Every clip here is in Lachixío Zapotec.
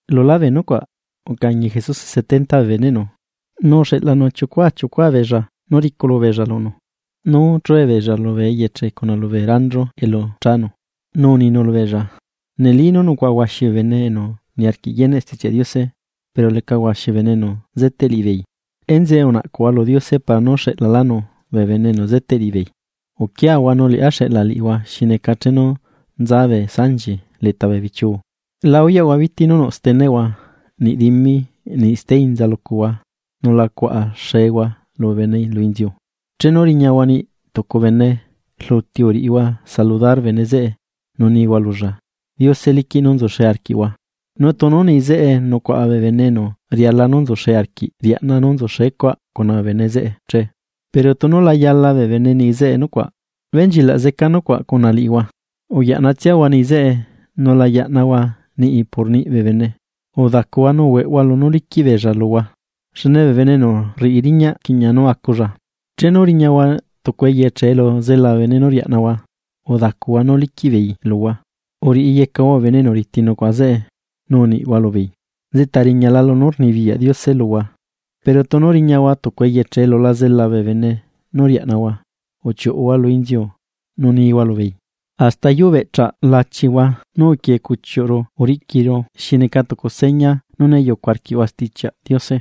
Lulá bee nucuaꞌ, ucañi Jesuse setenta bee beneꞌnu, nu uxeꞌlanu chiucua chiucua beella nú riculu beella lunu, nú chue beella lubee eyeche cuna lubee ranchu elu chanu. Nu uninu lubeella: ―Neli nú nucuaꞌa huaxi bee bene enu niarquiꞌ yeneꞌ Stichiaꞌ Diose, pero leca huaxi bee bene enu zeteꞌ liꞌibeei. Enzeꞌe unaꞌcuꞌhua lu Diose para nú xeꞌlalánu bee bene enu zeteꞌ liꞌibeei. Uquiahua, liꞌá xeꞌla liꞌihua xi neca chenu nza bee sanchi leta bee bichiu. La uyaꞌhua biti, nú nuꞌ steneꞌhua niꞌ dimi, niꞌ steinza lucuhua nu la cuaꞌa xehua lubee bene lu inziu. Chenu riñahua niꞌi tucu bene, rluti uriꞌihua saludar bene zeꞌe nú nihua lulla: “Diose liquiꞌ nú nzuxe arquiꞌhua.” Nu tunu niꞌi zeꞌe nucuaꞌa bee bene enu riala nú nzuxe arquiꞌ riaꞌna nú nzuxecuaꞌ cuna bee bene zeꞌe che, pero tunu la yala bee bene niꞌi zeꞌe nucuaꞌ, benchilaꞌ zeca nucuaꞌ cuna liꞌihua. Uyaꞌnatsiahua niꞌi zeꞌe, nu la yaꞌnahua niꞌi por niꞌi bee bene, udacuhua nu hueꞌhua lunú liquiꞌ beella luhua, xne bee bene enu rriꞌi riñaꞌ rquiꞌña nú aculla. Chenu riñahua tucu eyeche elu zela bee bene nú riaꞌnahua, udacuhua nú liquiꞌ beei luhua, uriyecahua bee bene enu riti nucuaꞌa zeꞌe, nu uniꞌhua lubeei: “Nzeꞌta riñala lunú rnibiyaꞌ Diose luhua.” Pero tunu riñahua tucu eyeche elu la zela bee bene nú riaꞌnahua, uchiuꞌhua lu inziu nu nihua lubeei: “¡Hasta yuu beꞌcha lachihua nú uquie cuchiuꞌru uriꞌquiru xi neca tucu seña nú né yucu arquiꞌhua Stichiaꞌ Diose!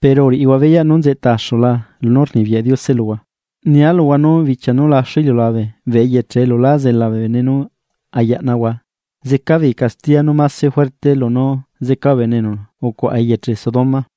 Pero uriꞌihua beyaꞌ nú nzeꞌta axula lunú rnibiyaꞌ Diose luhua.” Nia luhua nú bichia nú laxu iliulabe, bee eyeche elu lá zela bee bene, nú ayaꞌnahua, zeca beei castiya nú mase juerte, lunú zeca bee bene enu ucuaꞌa eyeche Sodoma.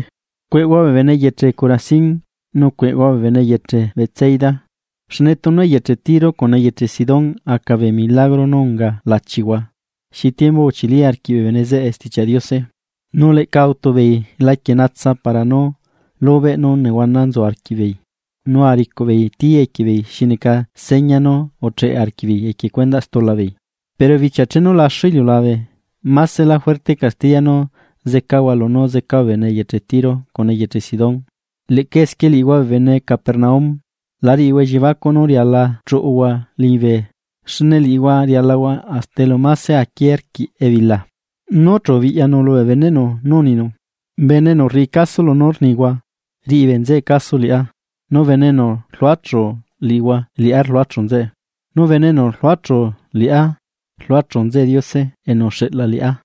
’¡Cueꞌhua bee bene eyeche Corazín! ¡Nu cueꞌhua bee bene eyeche Betsaida! Xne tunu eyeche Tiro cuna eyeche Sidón aca bee milagro nú unga lachihua, xi tiembu achili arquiꞌ bee bene zeꞌe Stichiaꞌ Diose, nu leꞌca autu beei laquie natsa para nú lubeꞌ nú nehuana nzu arquiꞌbeei nu aricuꞌ beei tí equie beei xi neca seña nú ucheꞌe arquiꞌbeei lu stula beei. Pero bichia chenu laxu iliulabe, másela juerte castiya nú zecahua lunú zeca bee bene eyeche Tiro cuna eyeche Sidón. Leꞌca esquie liꞌihua bee bene Capernaum, la riꞌihua elliebacuꞌ nú riala chuꞌuhua liñibe xne liꞌihua rialahua hasta elu mase aquié rquiꞌ ebila. ’Nu chu ubiꞌyanu lubee beneꞌnu nu uninu: ―Bene enu rriꞌi caso lunú rnihua, rriꞌi bee nzeꞌe caso liꞌá, nu bene enu rluachu liꞌihua liꞌá rluachu nzeꞌe, nu bene enu rluachu liꞌá rluachu nzeꞌe Diose enu uxeꞌla liꞌá.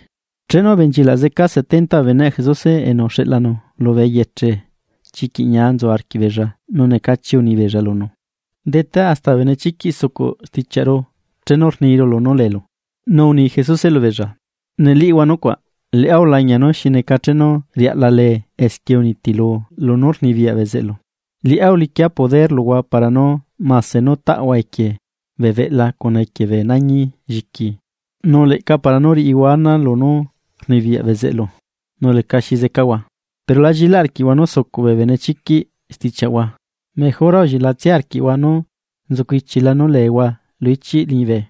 Chenu ubenchilaꞌ zeca setenta bee beneꞌ Jesuse enu uxeꞌlanu lubee eyeche, chiquiꞌ ñia nzu arquiꞌbeella nu necachi uni beella lunu: ―¡Detá, hasta bee benechiquiꞌ sucuꞌ stichiaꞌru chenu rniru lunú leelu! Nu uni Jesuse lubeella: ―Nelíꞌhua nucuaꞌ, liꞌá ulañia nú xi neca chenu riaꞌla lee esquie uniti lunú rnibiyaꞌ bezeꞌlu. Liꞌá uliquia lunú rnibiyaꞌa luhua, para nú mase nú taꞌhua equie bee beꞌla cuna equie bee nañi lliqui, nu leꞌca para nú riꞌihua ana lunú rnibiyaꞌ bezeꞌlu, nu lecaxi zecahua. Pero la llilaꞌ arquiꞌhua nú sucuꞌ bee benechiquiꞌ stichiaꞌhua, mejora ullilaꞌhua nú nzucu ichila nú leehua lu ichiꞌ liñibe.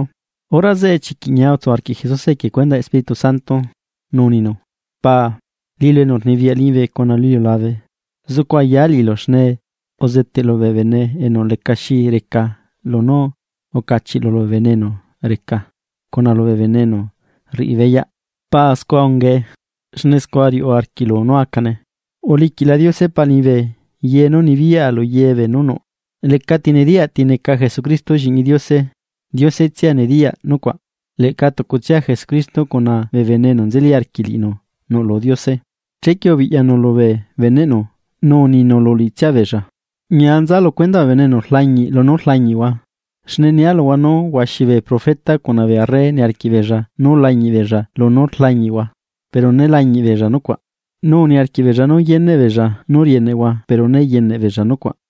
Hora zeꞌe chiquiꞌ ñia utsu arquiꞌ Jesuse equie cuendaꞌ Espíritu Santo, nu uninu: ―Paa liꞌilu enu rnibiyaꞌ liñibe cuna lu iliulabe, zucu ayáa liꞌilu xne uzeteꞌlu bee bene enu lecaxi reca lunú ucachiꞌlu lubee bene enu reca cuna lubee bene enu rriꞌi beyaꞌ. Paa scua ungae, xne scua riuꞌ arquiꞌlu nú acane. ’Uliquiꞌla Diose Pa liñibe ye nú nibiyaꞌa lu ye beenú nuꞌ. Lecati nediyaꞌ ti neca Jesucristo Lliꞌñi Diose, Diose tsia nediyaꞌ nucuaꞌ, leꞌca tucutsia Jesucristo cuna bee bene enu nzeli arquiꞌ liꞌinu nuꞌlu Diose. Chequie ubiꞌyanu lubee beneꞌnu, nu uninu lu liꞌitsia beella: ―Ñia nza lu cuendaꞌ bee bene enu rlañiꞌ lunú rlañiꞌhua, xne nia luhua nú huaxi bee profeta cuna bee arre uniarquiꞌ beella nú lañiꞌ beella lunú rlañiꞌhua, pero né lañiꞌ beella nucuaꞌ. Nu uniarquiꞌ beella nú yeneꞌ beella nú rieneꞌhua pero né yeneꞌ beella nucuaꞌ.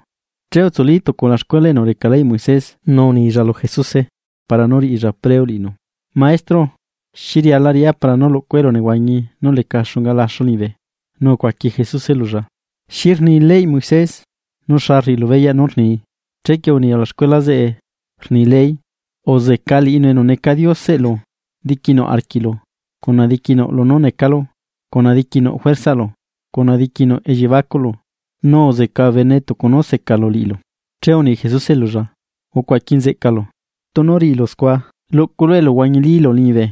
Che utsuli tucu ulaxcuela enu reca leyꞌ Moisés nu unilla lu Jesuse para nú riꞌilla preo liꞌinu: ―Maestro, xi riala riꞌá para nú lucua elunehuañi nú leca xunga laxu liñibe. Nu ucuaqui Jesuse lulla: ―¿Xi rni leyꞌ Moisés? ¿Nu xa rriꞌilu beyaꞌ nú rnii? Chequie uni ulaxcuela zeꞌe, rni ley: ―“Uzeca liꞌinu enu neca Dioseꞌlu diquinuꞌ arquiꞌlu, cuna diquinuꞌ lunú necalu, cuna diquinuꞌ juerzalu, cuna diquinuꞌ elliebacuꞌlu, nu uzeca bee bene tucu nú secalu liꞌilu.” Che uni Jesuse lulla: ―Ucuaqui nzeꞌcalu, tunu riꞌilu scua, luꞌculu eluhuañilílu liñibe.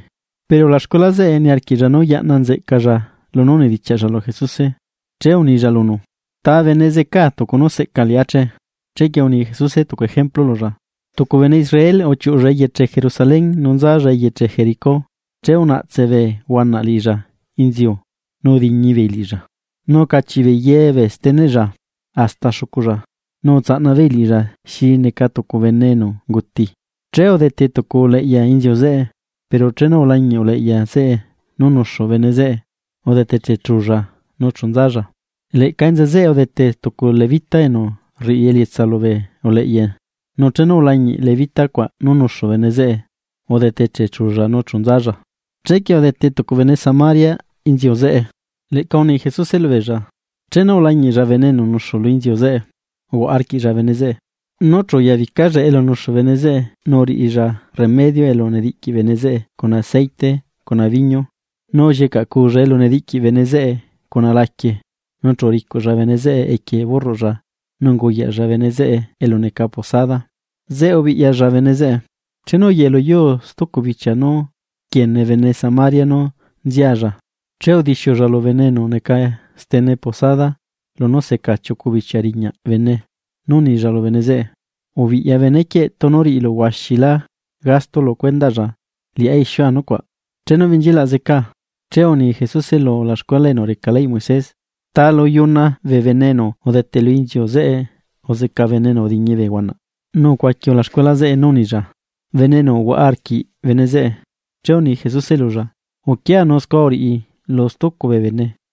Pero ulaxcuela zeꞌe niarquiꞌlla nú yaꞌna nzeꞌcalla lunú unidichiaꞌlla lu Jesuse, che unilla lunu: ―¿Ta bene zecaa tucu nú seꞌca liꞌá che? Chequie uni Jesuse tucu ejemplu lulla: ―Tucu bene Israel uchiuꞌulla eyeche Jerusalén nu nzalla eyeche Jericó, che unaꞌtse bee huanaꞌ liꞌilla inziu nu udiñi beei liꞌilla, nu ucachiꞌ beei ye bee steneꞌlla hasta xuculla. Nu utsaꞌna beei liꞌilla xi neca tucu bene enu unguti. Che udete tucu uleꞌya inziu zeꞌe, pero chenu ulañiꞌ uleꞌya zeꞌe nú nuxu bene zeꞌe, udete chechulla nu chu nzalla. Leꞌca enza zeꞌe udete tucu levita enu rriꞌi elietsa lubee uleꞌya, nu chenu ulañiꞌ levita cuaꞌ nú nuxu bene zeꞌe, udete chechulla nu chu nzalla. Chequie udete tucu bene Samaria inziu zeꞌe, chenu ulañiꞌlla bene enu nuxu lu inziu zeꞌe, uhuaꞌa arquiꞌlla bene zeꞌe. Nu chu uyabicalla elu nuxu bene zeꞌe nu uriꞌilla remedio elu nediꞌqui bene zeꞌe cuna aceite cuna biñu, nu ullicaꞌcuulla elu nediꞌqui bene zeꞌe cuna laquie. Nu chu uricuꞌlla bene zeꞌe equie burruꞌlla nu unguyaꞌlla bene zeꞌe elu neca posada, zeꞌe ubiꞌyalla bene zeꞌe. Chenu uyeꞌe lu yuu stucu bichia nú rquiene bene Samaria nú nzialla, che udixiulla lu bene enu neca stene posada lunú seca chiucu bichia riñaꞌ bene nu unilla lu bene zeꞌe: “Ubiꞌya benequieꞌ, tunu riꞌilu huaxilá gasto lu cuendaꞌlla, liꞌá ixiua nucuaꞌ chenu benchilaꞌ zecaa.” Che uni Jesuse lu ulaxcuela enu reca leyꞌ Moisés: ¿Taa lu chuna bee bene enu udete lu inziu zeꞌe uzeca bene enu udiñi bee huanaꞌ? Nu ucuaqui ulaxcuela zeꞌe nú unilla: ―Bene enu uhuaꞌa arquiꞌ bene zeꞌe. Che uni Jesuse lulla: ―Uquia nu scua uriꞌi lu stucu bee bene.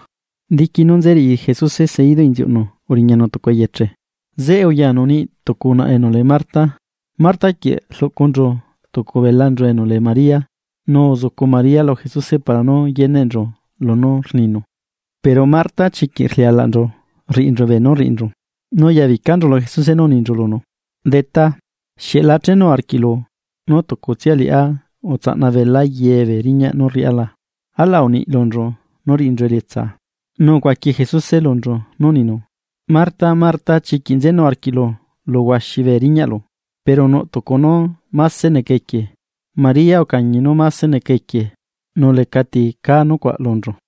Diqui nú nze riꞌi Jesuse seidu inziuꞌnu uriñanu tucu eyeche, zeꞌe uyanu niꞌi tucu unaꞌa enu lee Marta. Marta quieꞌ rluꞌcunchu tucu belanchu enu lee María, nu uzucu María lu Jesuse para nú yeneꞌnchu lunú rninu. Pero Marta chiquiꞌ rlialaꞌnchu rriꞌinchu beenú rriꞌinchu, nu uyabicanchu lu Jesuse nu uninchu lunu: ―Detá, ¿Xieꞌ la chenu arquiꞌlu nú tucutsia liꞌá utsaꞌna belaa ye bee riñaꞌ nú riꞌá la? Alaꞌ uniꞌi lunchu nú riꞌinchu elietsaa. Nu ucuaqui Jesuse lunchu nú uninu: ―Marta, Marta, chiquiꞌ nzenu arquiꞌlu lu huaxi bee riñaꞌlu, pero nuꞌ tucu nú máse neca equie. Maria ucañi nú máse neca equie, nu lecati caa nucuaꞌ lunchu.